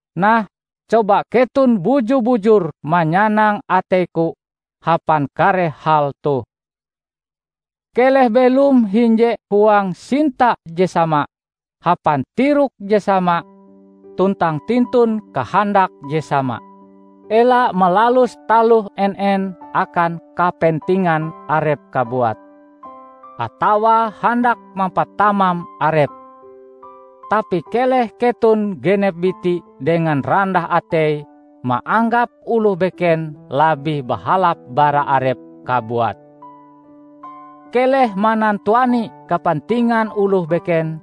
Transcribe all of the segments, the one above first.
Nah, coba keton buju-bujur manyanang ateiku hapan kare hal toh: keleh belom hinje huang sinta je sama, hapan tirok je sama tuntang tintun kahandak je sama. Ela malalus taloh en-en akan kapentingan arep kabuat, atawa handak mampatamam arep. Tapi keleh keton genep biti dengan randah atei maanggap oloh beken labih bahalap bara arep kabuat. Keleh manantuani kapentingan oloh beken;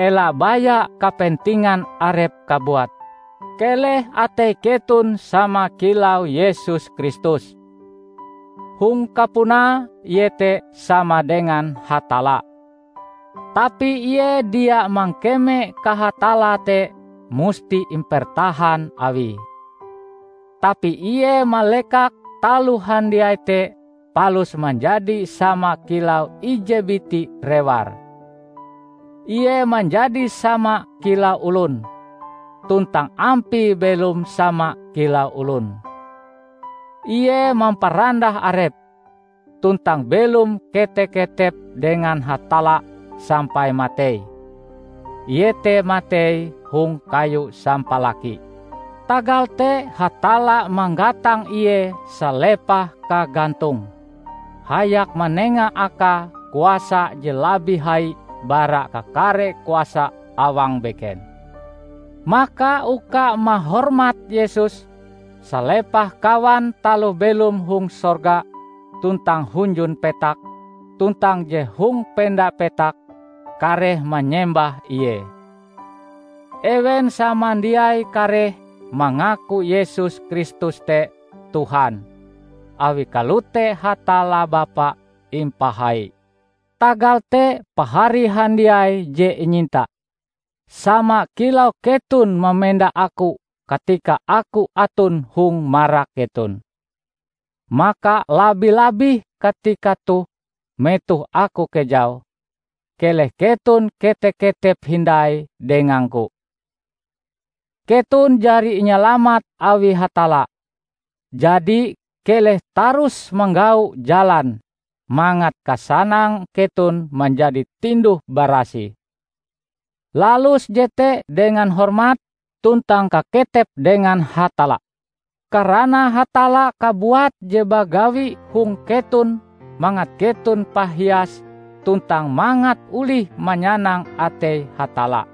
ela baya kapentingan arep kabuat. Keleh atei keton sama kilau Yesus Kristus: Hong kapunae Ie te sama dengan Hatalla, tapi Ie dia mangkeme kahatallae te musti impertahan Awie. Tapi Ie malekak taloh handiai te palus manjadi sama kilau ije biti rewar. Ie manjadi sama kilau olon, tuntang ampie belom sama kilau olon. Ie mamparandah Arepe, tuntang belom kete-ketep dengan Hatalla sampai matei -- iete matei hong kayu sampalaki. Tagal te Hatalla manggatang Ie salepah kagantonge, hayak manenga Akae kuasa je labih hai bara kakare kuasa awang beken. Maka uka mahormat Yesus, salepah kawan taloh belom hong sorga, tuntang hunjun petak, tuntang je hong penda petak, kareh manyembah Ie. Ewen samandiai kareh mangaku Yesus Kristus te Tuhan: awi kalote Hatalla Bapa impahai. Tagal te, pahari handiai je inyinta, sama kilau keton mamenda aku katika aku aton hong marak keton, maka labi-labih katika toh metoh aku kejau, keleh keton kete-ketep hindai dengangku. Keton jari inyalamat awi Hatalla, jadi keleh tarus manggau jalan mangat kasanang keton manjadi tinduh-barasih. Lalus jete dengan hormat tuntang kaketep dengan Hatalla, karana Hatalla kabuat je bagawi hong keton mangat keton pahias tuntang mangat olih manyanang atei Hatalla.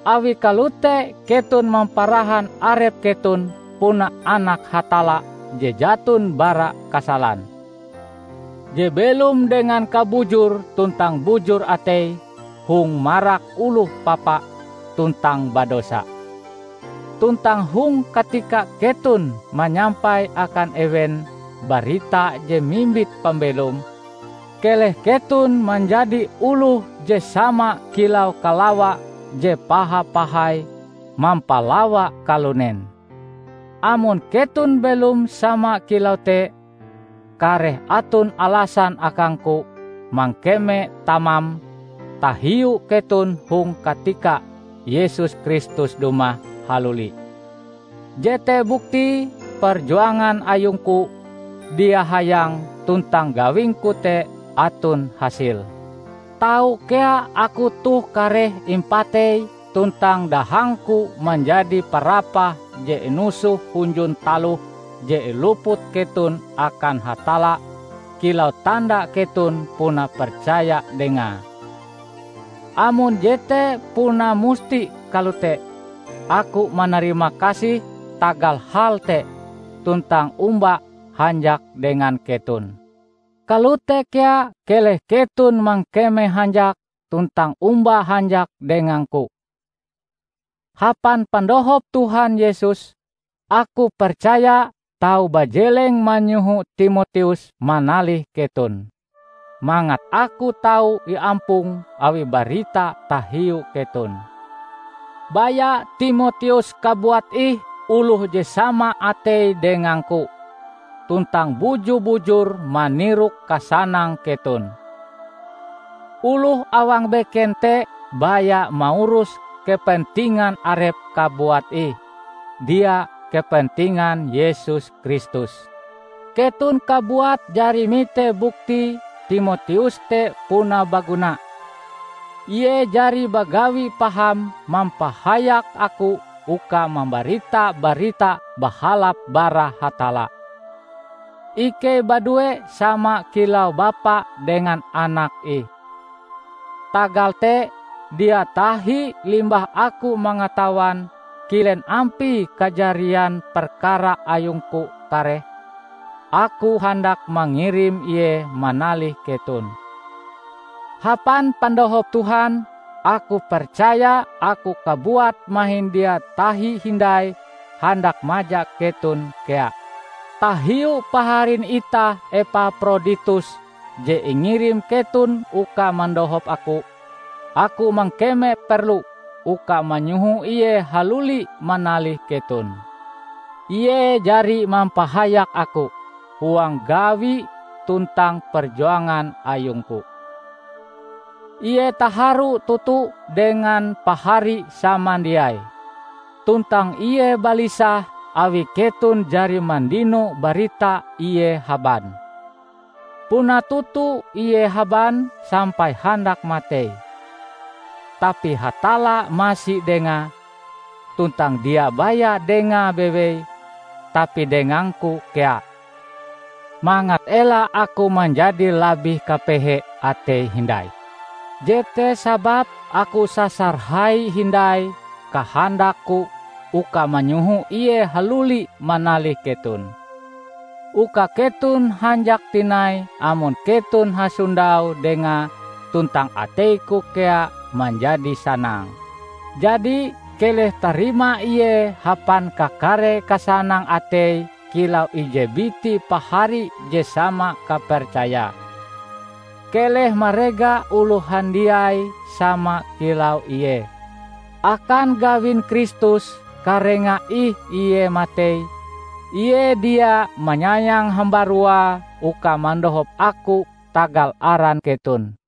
Awi kalote keton mamparahan arep keton puna anak Hatalla je jaton bara kasalan, je belom dengan kabujur tuntang bujur atei hong marak oloh papa tuntang badosa. Tuntang hong katika keton manyampai akan ewen barita je mimbit pambelom, keleh keton manjadi oloh je sama kilau kalawa je paha-pahai mampalawa kalunen. Amon keton belom sama kilau te, kareh aton alasan akangku mangkeme tamam tahiu keton hong katika Yesus Kristus dumah haluli. Jete buktie perjuangan ayungku dia hayang tuntang gawingku te aton hasile. Tau kea aku toh kareh impatei tuntang dahangku manjadi parapah je inusoh hunjun taloh je iluput keton akan Hatalla kilau tanda keton puna percaya Dengae. Amon jete puna musti kalote, aku manarimakasih tagal hal te tuntang omba hanjak dengan keton. Kalote kea keleh keton mangkeme hanjak tuntang omba hanjak dengangku. Hapan pandohop Tuhan Yesus, aku percaya tau bajeleng manyoho Timoteus manalih keton, mangat aku tau iampong awi barita tahiu keton. Baya Timoteus kabuat ih oloh je sama ateie dengangku, tuntang buju-bujur manirok kasanang keton. Oloh awang beken te baya maurus kepentingan arepe kabuat ih, dia kepentingan Yesus Kristus. Keton kabuat jari mite buktie Timoteus te puna baguna. Ie jari bagawi paham mampahayak aku uka mambarita Barita Bahalap bara Hatalla. Ikei badue sama kilau bapa dengan anak ih. Tagal te, dia tahi limbah aku mangatawan kilen ampie kajarian perkara ayungku kareh, aku handak mangirim ie manalih keton. Hapan pandohop Tuhan, aku percaya aku kabuat mahin dia tahi hindai handak maja keton kea. Tahiu paharin itah Epaproditus je ingirim keton uka mandohop aku, aku mangkeme perlu uka manyoho ie haluli manalih keton. Ie jari mampahayak aku huang gawi tuntang perjuangan ayungku. Ie taharu toto dengan pahari samandiai, tuntang ie balisah awi keton jari mandino barita ie haban. Puna toto ie haban sampai handak matei. Tapi Hatalla masi dengae; tuntang dia baya dengae bewei, tapi dengangku kea, mangat ela aku manjadi labih kapehe atei hindai. Jete sababe aku sasar hai hindai kahandakku uka manyoho ie haluli manalih keton, uka keton hanjak tinai amon keton hansondau dengae tuntang ateiku kea manjadi sanang. Jadi, keleh tarima ie hapan kakare kasanang atei kilau ije biti pahari je sama kapercayae. Keleh marega oloh handiai sama kilau ie. Akan gawin Kristus karenga ih ie matei; ie dia manyayang hambaruae uka mandohop aku tagal aran keton.